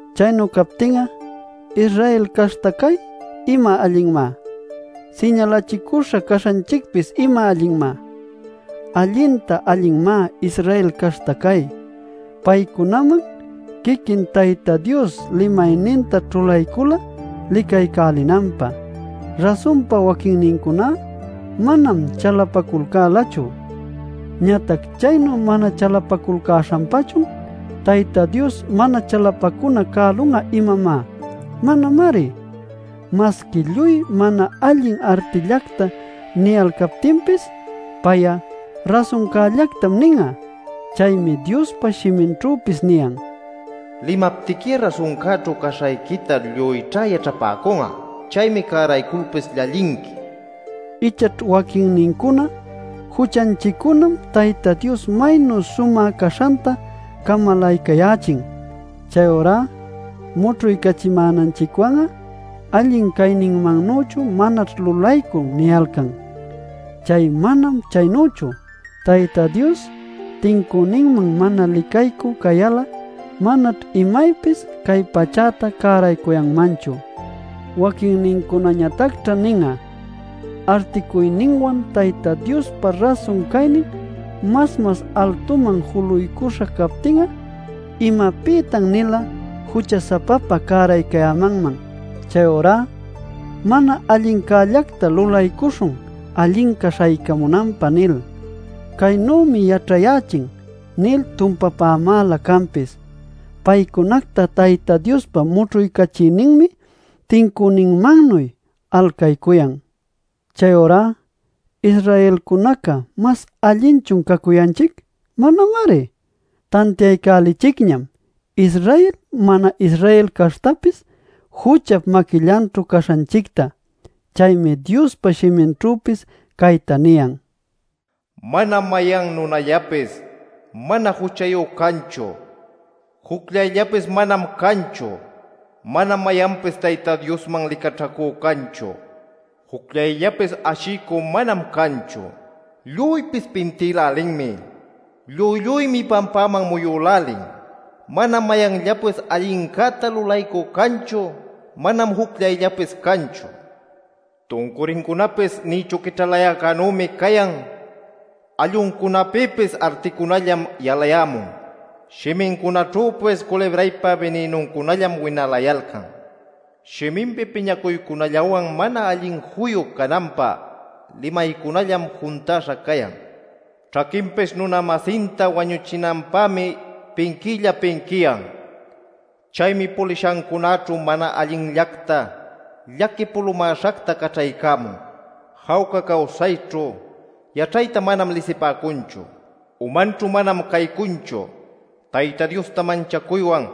Chaynu captin'a ¿Israel caśhta cay ima allinmá? ¿Siñalachicüśha caśhanchicpis ima allinmá? Allintá allinmá Israel caśhta cay: paycunaman quiquin Tayta Dios limayninta ćhulaycula licaycälinanpä. Rasunpa waquinnincuná manam chalapaculcälachu. Ñatac ¿chaynu mana chalapaculcäśhanpachun Tayta Dios mana chalapacuna cälun'a, imamá? ¡Manamari! Masqui lluy mana allin artillacta niyalcaptinpis, pay'a rasuncällactam nin'a. Chaymi Diospa shiminćhüpis niyan: “Limaptiqui'a rasuncäćhu caśhayquita lluyćha yaćhapäcun'a; chaymi cärayculpis llallinqui” nil. Ichaćh waquinnincuna: “Juchanchiccunam Tayta Dios maynu sumä caśhanta camalaycayächin; chayurá mućhuycachimänanchicwan'a allin cayninmannüchu manaćh lulaycun” niyalcan. ¡Chay manam chaynüchu! Tayta Dios tincüninman mana licaycü cayal'a, manaćh imaypis cay pachäta cäraycuyanmanchu. Waquincunañatacćha nin'a: “Articuynïwan Tayta Diospa rasun caynin mas-mas altuman juluycuśha cayaptin'a, ¿imapïtan-nila jucha-sapapa cäraycayämanman? Chayurá mana allincällacta lulaycuśhun allinca śhaycamunanpä” nil. “Caynümi yaćhayächin” nil tumpapämanlä canpis. Paycunacta Tayta Diospa mućhuycachiyninmi tincüninmannuy alcaycuyan. Chayurá ¿Israelcunaca mas allinchun cacuyanchic? ¡Manamari! Tantiaycälichicñam Israel mana-Israel caśhtapis juchap maquillanćhu caśhanchicta. Chaymi Diospa shiminćhüpis cayta niyan: “¡Manam mayan nunallapis mana juchayu canchu! ¡Jucllayllapis manam canchu! ¡Manam mayanpis Tayta Diosman licaćhacü canchu! ¡Jucllayllapis ashiycü manam canchu! Lluypis pintïlälinmi; lluy lluymi pampaman muyülälin. ¡Manam mayanllapis allincäta lulaycü canchu; manam jucllayllapis canchu! Tuncurincunapis nïchu quićhalayäcänümi cayan; alluncunapïpis articunallam yalayämun; shimincunaćhüpis culibraypa bininuncunallam winalayalcan. Shiminpi piñacuycunallawan mana allin juyu cananpä limaycunallam juntäśha cayan. Ćhaquinpis nuna-masinta wañuchinanpämi pinquiylla pinquiyan. Chaymi pulishancunaćhu mana allinllacta, llaqui pulumäśhacta caćhaycamun. Jawca cawsayćhu yaćhayta manam lisipäcunchu. Umanćhu manam caycunchu Tayta Diosta manchacuywan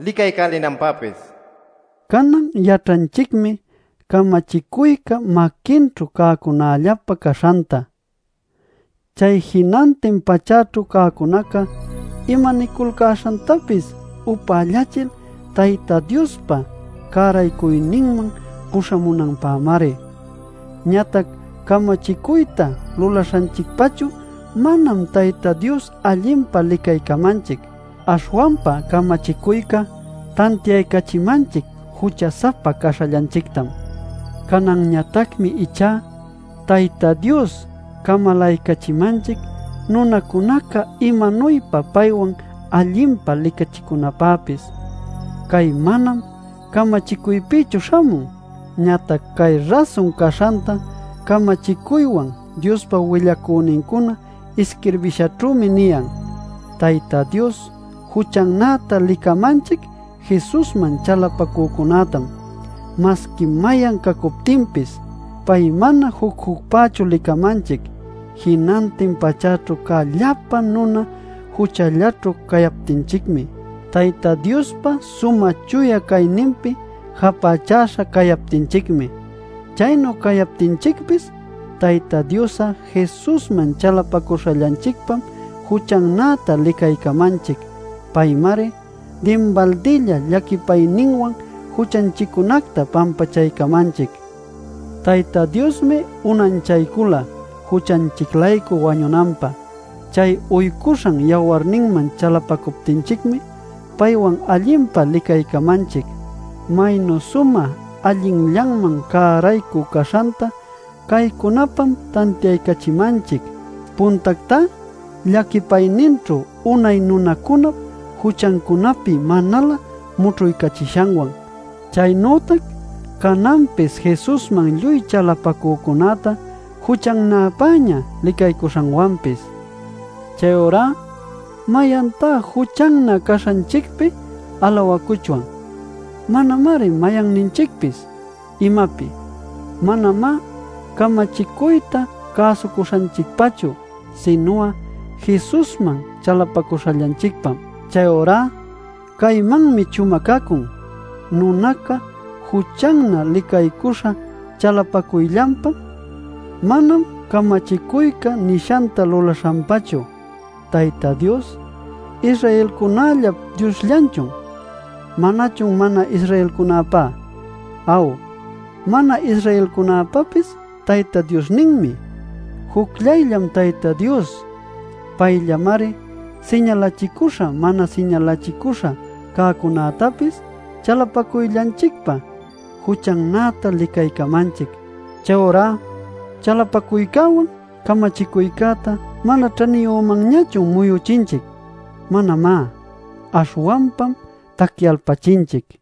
licaycälinanpäpis” nil. Canan yaćhanchicmi camachicuyca maquinćhu cäcunällapä caśhanta. Chay jinantin pachäćhu cäcunaca imaniculcäśhantapis upällachil Tayta Diospa cäraycuyninman puśhamunanpämari. Ñatac camachicuyta lulaśhanchicpachu manam Tayta Dios allinpa licaycamanchic. Aśhwanpa camachicuycá tantiaycachimanchic jucha-sapa caśhallanchictam. Cananñatacmi ichá Tayta Dios camalaycachimanchic nunacunaca imanuypa paywan allinpa licachicunapäpis. Cay manam camachicuypïchu śhamun. Ñatac cay rasun caśhanta camachicuywan Diospa willacünincuna isquirbishanćhümi niyan. Tayta Dios juchannäta licamanchic Jesusman chalapacücunätam, masqui mayan cacuptinchicpis. Pay mana juc-jucpächu licamanchic jinantin pachäćhu cä llapa nuna juchallaćhu cayaptinchicmi, Tayta Diospa sumä chuya cayninpi japächäśha cayaptinchicmi. Chaynu cayaptinchicpis Tayta Dios'a Jesusman chalapacuśhallanchicpam juchannäta licaycamanchic. Paymari dinbaldilla llaquipayninwan juchanchiccunacta pampachaycamanchic. Tayta Diosmi unanchaycula juchanchic-laycu wañunanpä. Chay uycuśhan yawarninman chalapacuptinchicmi paywan allinpa licaycamanchic. Maynu sumä allinllanman cäraycü caśhanta caycunapam tantiaycachimanchic: puntactá, llaquipayninćhu unay nunacunap juchancunapi manalä mućhuycachishanwan, chaynütac cananpis Jesusman lluy chalapacücunäta juchannäpäña licaycuśhanwanpis. Chayurá ¿mayantá juchannä caśhanchicpi alawacuchwan? ¡Manamari mayanninchicpis! ¿Imapi? Manamá camachicuyta cäsucuśhanchicpachu, sinu'a Jesusman chalapacuśhallanchicpam. Chayurá caymanmi chumacacun: nunaca juchannä licaycuśha chalapacuyllanpam, manam camachicuyca nishanta lulaśhanpachu. Tayta Dios ¿Israelcunällap Diosllanchun? ¿Manachun mana-Israelcunapá? Aw, mana-Israelcunäpäpis Tayta Diosninmi. Jucllayllam Tayta Dios. Payllamari siñalachicüśha mana siñalachicüśha cäcunätapis chalapacuyllanchicpa juchannäta licaycamanchic. ¿Chayurá chalapacuycäwan camachicuyta mana ćhaniyümanñachun muyuchinchic? ¡Manamá! Aśhwanpam tacyalpachinchic.